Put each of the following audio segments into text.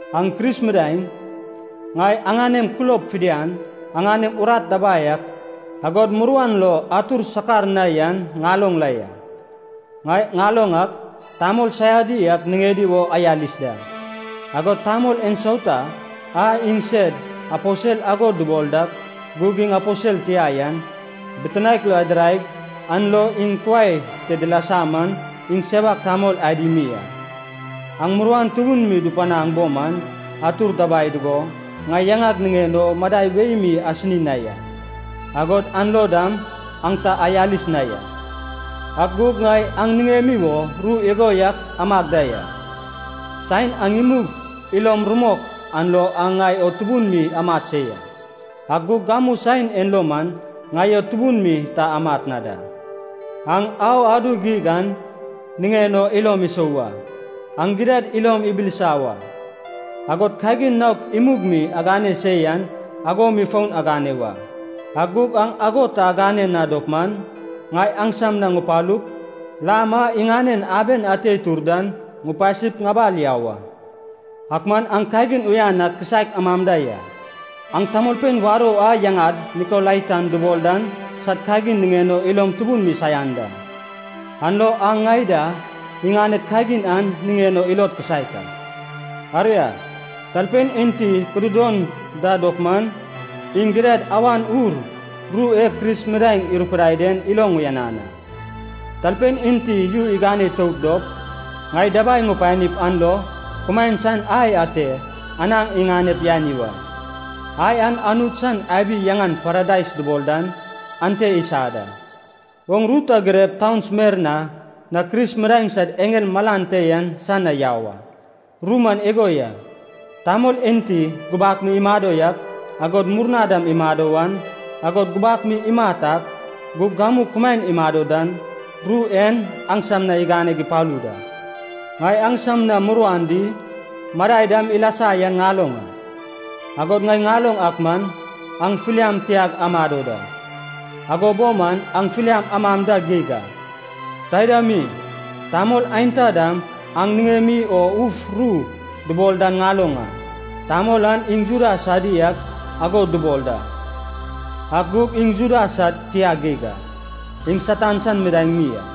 Aŋ Kris midaeŋ, ŋai aŋanem kulob fidian, aŋanem urat dabai ak, agod muruan lo atur sakar na yan ŋaloŋ la ya. Ŋai ŋaloŋ ak, tamol saiadi ak niŋedi wo ayalis da, agod tamol ensauta a iŋsed aposel ago dubol dak gug iŋ aposel tia yan, bitinaek lo adiraig an lo iŋ kuai te dilasa man iŋ sewak tamol adi mi a. Aŋ muruan tubun mi dupanaŋ bo man atur dabai dugo, ŋai yaŋag niŋen o madai wei mi asini na ya, agod an lo dam aŋ ta ayalis na ya. Ak gug ŋai aŋ niŋemi wo ru igo yak amag da ya, saen aŋ imug ilom rumok an lo aŋ ŋai o tubun mi amat se ya, ak gug gamu saen en lo man ŋai o tubun mi ta amat na da. Aŋ au adu geig an niŋen o ilom isou wa. Aŋ gidad ilom ibilisa wa, agod kagin naok imug mi agane se yan ago mi fon agane wa. Ak gug aŋ ago ta agane na dop man, ŋai aŋsam na ŋupalup, lam a iŋanen aben ate itur dan ŋupasip ŋabal yau a. Ak man aŋ kagin uyan ak kisaek amam da ya. Aŋ tamolpein warou a yaŋad Nikolaitan dubol dan sad kagin niŋen o ilom tubun mi saian da, an lo aŋ ŋai da iŋaned kagin an niŋen o ilod kisaek a. Aria, talpein enti kududon da dop man, iŋ gidad Awan Ur ru e Kris midaeŋ irupidai den iloŋ uyanan a. Talpein enti yu igane itout dop, ŋai dabai ŋupanip an lo, kumaen san ai ate anaŋ iŋanep yani wa. Ai an Anut san abi yaŋan Paradais dubol dan, ante isa da. “Oŋ ru ta girep taun Smerna na Kris midaeŋ sad eŋel malan te yan san na yau a. Ru man igo ya. Tamol enti gubak mi imado yak, agod murna dam imado wan, agod gubak mi imat ak, gug gamu kumaen imado dan, ru en aŋsam na iganeg ipalu da. Ŋai aŋsam na muruan di, madai dam ilasa yan ŋaloŋ a. Agod ŋai ŋaloŋ ak man, aŋ filiam tiag amado da. Ago bo man aŋ filiam amam da geig a. Taida mi, tamol aenta dam aŋ niŋem o uf ru dubol dan ŋaloŋ a. Tamol an iŋ Juda sadi ak ago dubol da, ak gug iŋ Juda sad tia geig a. Iŋ Satan san midaeŋ mi a.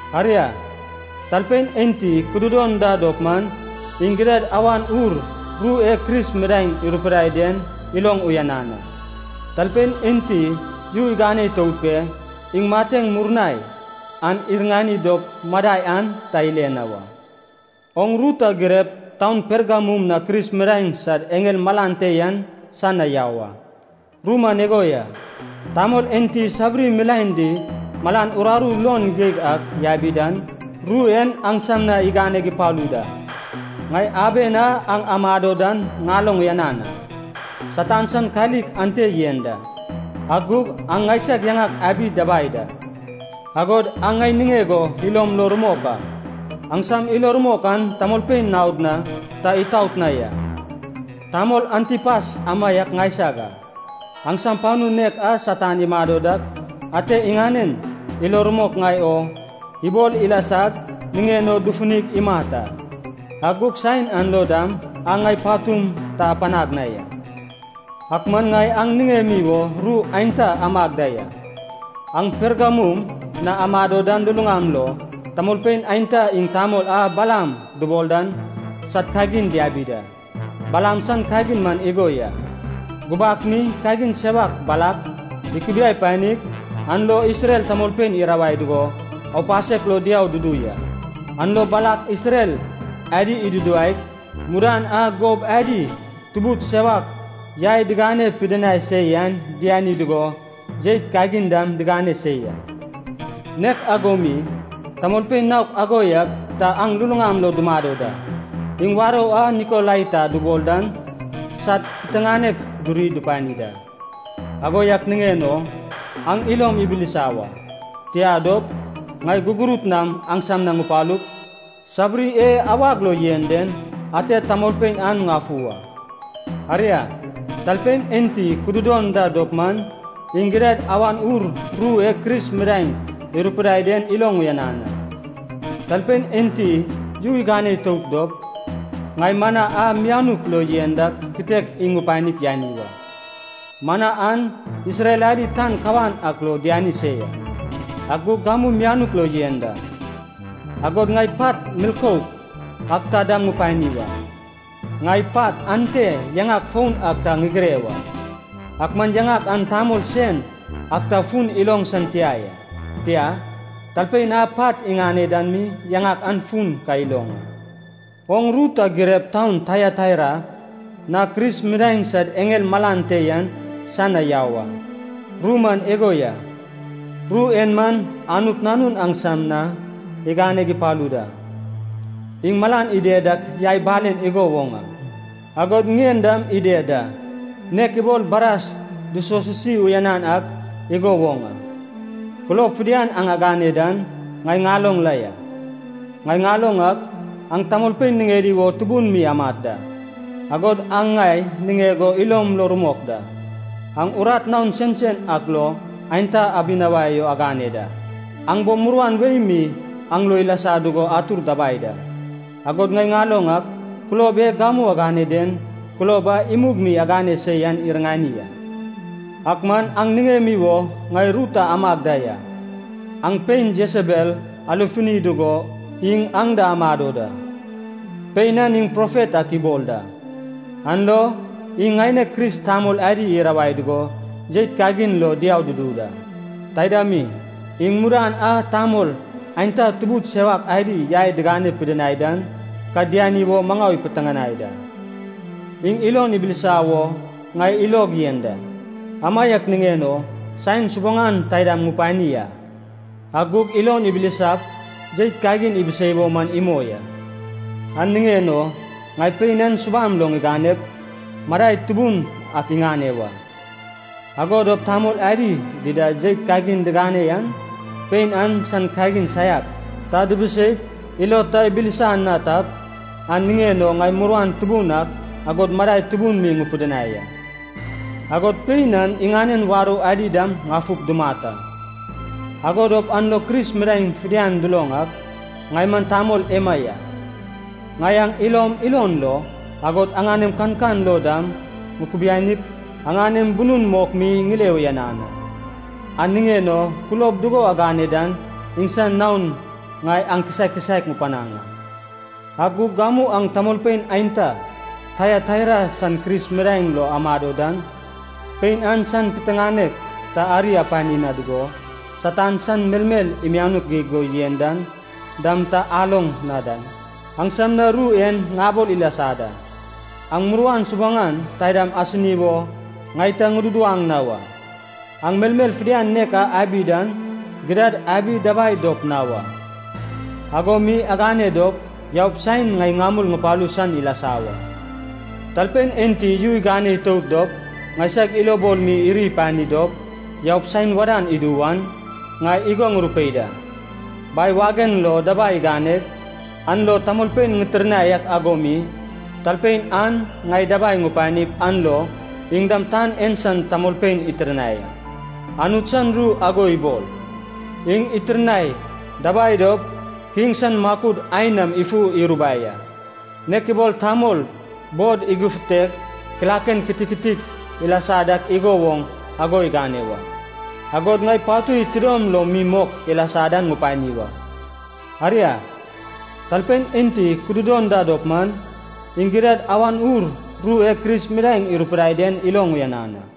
Aria, talpein enti kududon da dop man, iŋ gidad Awan Ur ru e Kris midaeŋ irupidai den iloŋ uyanan a. Talpein enti yu igane itout pe, iŋ mateŋ murnai an iriŋani dop madai an ta ile na wa. “Oŋ ru ta girep taun Pergamum na Kris midaeŋ sad eŋel malan te yan san na yau a. Ru man igo ya. Tamol enti sabiri milaen di malan uraru luon geig ak yabi dan, ru en aŋsam na iganeg ipalu da. Ŋai aben a aŋ amado dan ŋaloŋ uyanan a. Satan san kalik ante yen da. Ak gug aŋ ŋaisag yaŋag abi dabai da, agod aŋ ŋai niŋeg o ilom lo rumok a, aŋsam ilo rumok an tamolpein naod na ta atot na ya. Tamol Antipas amaiak ŋaisag a, aŋsam panu nek a Satan imado dak ate iŋanen ilo rumok ŋai o ibol ilasag niŋen o dufunig imat a. Ak gug saen an lo dam aŋ ŋai patum ta apanag na ya. Ak man ŋai aŋ niŋemi wo ru aenta amag da ya. Aŋ Pergamum na amado dan luluŋam lo, tamolpein aenta iŋ tamol a Balaam dubol dan san kagin diabi da. Balaam san kagin man igo ya. Gubak mi kagin sewak Balak ikubiai panig, an lo Isrel tamolpein irawai dugo, aupasek lo diau dudu ya. An lo Balak Isrel adi iduduwaig, mudan a gob adi tubud sewak yai digane pidinai se yan diani dugo, jeit kagin dam digane se ya. Nek ago mi, tamolpein naok ago yak ta aŋ luluŋam lo dumado da, iŋ warou a Nikolaitan dubol dan sad piteŋanek duri dupani da. Ago yak niŋen o aŋ ilom ibilisa wa. Tia dop, ŋai gugurut nam aŋsam na ŋupalup, sabiri e awag lo yen den, ate tamolpein an ŋafu wa. Aria, talpein enti kududon da dop man, iŋ gidad Awan Ur ru e Kris midaeŋ irupidai den iloŋ uyanan a. Talpein enti yu igane itout dop, ŋai mana a mianuk lo yen dan kitek iŋ ŋupanip yani wa. Mana an Isrel adi tan kawan ak lo diani se ya, ak gug gamu mianuk lo yen da. Agod ŋai pat milkouk ak ta dam ŋupani wa. Ŋai pat ante yaŋak foun ak ta ŋigire wa, ak man yaŋak an tamol sen ak ta fun iloŋ san tia ya. Tia, talpein a pat iŋane dan mi yaŋak an fun ka iloŋ a. “Oŋ ru ta girep taun Taiataira na Kris midaeŋ sad eŋel malan te yan san na yau a. Ru man igo ya. Ru en man Anut Nanun aŋsam na iganeg ipalu da. Iŋ malan ided dak yai balen igo woŋ a, agod ŋien dam ided da, nek ibol bras dusosisi uyanan ak igo woŋ a. Kulob fidian aŋ agane dan, ŋai ŋaloŋ la ya. Ŋai ŋaloŋ ak, aŋ tamolpein niŋedi wo tubun mi amat da. Agod aŋ ŋai niŋeg o ilom lo rumok da. Aŋ urat naon sensen ak lo aenta abinawai o agane da. Aŋ bo muruan wei mi aŋ lo ilasa dugo atur dabai da. Agod ŋai ŋaloŋ ak, kulob e gamu agane den, kulob a imug mi agane se yan iriŋani a. Ak man aŋ niŋemi wo ŋai ru ta amag da ya. Aŋ pein Jesebel alefuni dugo iŋ aŋ da amado da. Pein an iŋ profet ak ibol da. An lo iŋ ŋaineg Kris tamol adi irawai dugo jeit kagin lo diau dudu da. Taida mi, iŋ mudan a tamol aenta tubud sewak adi yai digane pidinai dan ka diani wo maŋau ipiteŋanai da. Iŋ ilon ibilisa wo ŋai ilog yen da, amaiak niŋen o saen subuŋan taidam ŋupani a. Ak gug ilon ibilisap jeit kagin ibisei wo man imoi a. An niŋen o ŋai pein an subam lo ŋiganep, madai tubun ak iŋane wa. Ago dop tamol adi dida jeit digane na yan, pein an san kagin saiak ta dibiseip ilod ta ibilisa na tap, an niŋen o ŋai muruan tubun ak, agod madai tubun mi ŋupidinai a. Agod pein an iŋanen warou adi dam ŋafup dumat a. Ago dop an lo Kris midaeŋ fidian duloŋ ak, ŋai man tamol ema ya: ŋai aŋ ilom ilon lo, agod aŋanem kankan lo dam ŋukubianip aŋanem bunun mok mi ŋile uyanan a. An niŋen o kulob dugo agane dan iŋsan naon ŋai aŋ kisaek kisaek ŋupanaŋ a. Ak gug gamu aŋ tamolpein aenta, Taiataira san Kris midaeŋ lo amado dan, pein an san piteŋanek ta ari apani na dugo, Satan san melmel imianuk geig go yen dan dam ta aloŋ na dan, aŋsam na ru en ŋabol ilasa da. Aŋ muruan subuŋan taidam asini wo ŋai ta ŋududuwaŋ na wa. Aŋ melmel fidian nek a abi dan, gidad abi dabai dop na wa. Ago mi agane dop yaup saen ŋai ŋamul ŋupalu san ilasa wa. Talpein enti yu igane itout dop ŋaisag ilobol mi iri ipani dop yaup saen wadan idu wan, ŋai igo ŋurupei da. Bai wagen lo dabai ŋiŋaneg, an lo tamolpein ŋitirnai ak ago mi, talpein an ŋai dabai ŋupanip an lo iŋ dam tan en san tamolpein itirnai a. Anut san ru ago ibol, ‘Iŋ itirnai dabai dop kiŋ san makud ain nam ifu irubai a, nek ibol tamol bod igufutep kilaken kitiktik ilasa dak igo woŋ ago igane wa.’ Agod ŋai patui tidom lom mi mok ilasa dan ŋupani wa. Aria, talpein enti kududon da dop man, iŋ gidad Awan Ur ru e Kris midaeŋ irupidai den iloŋ uyanan a.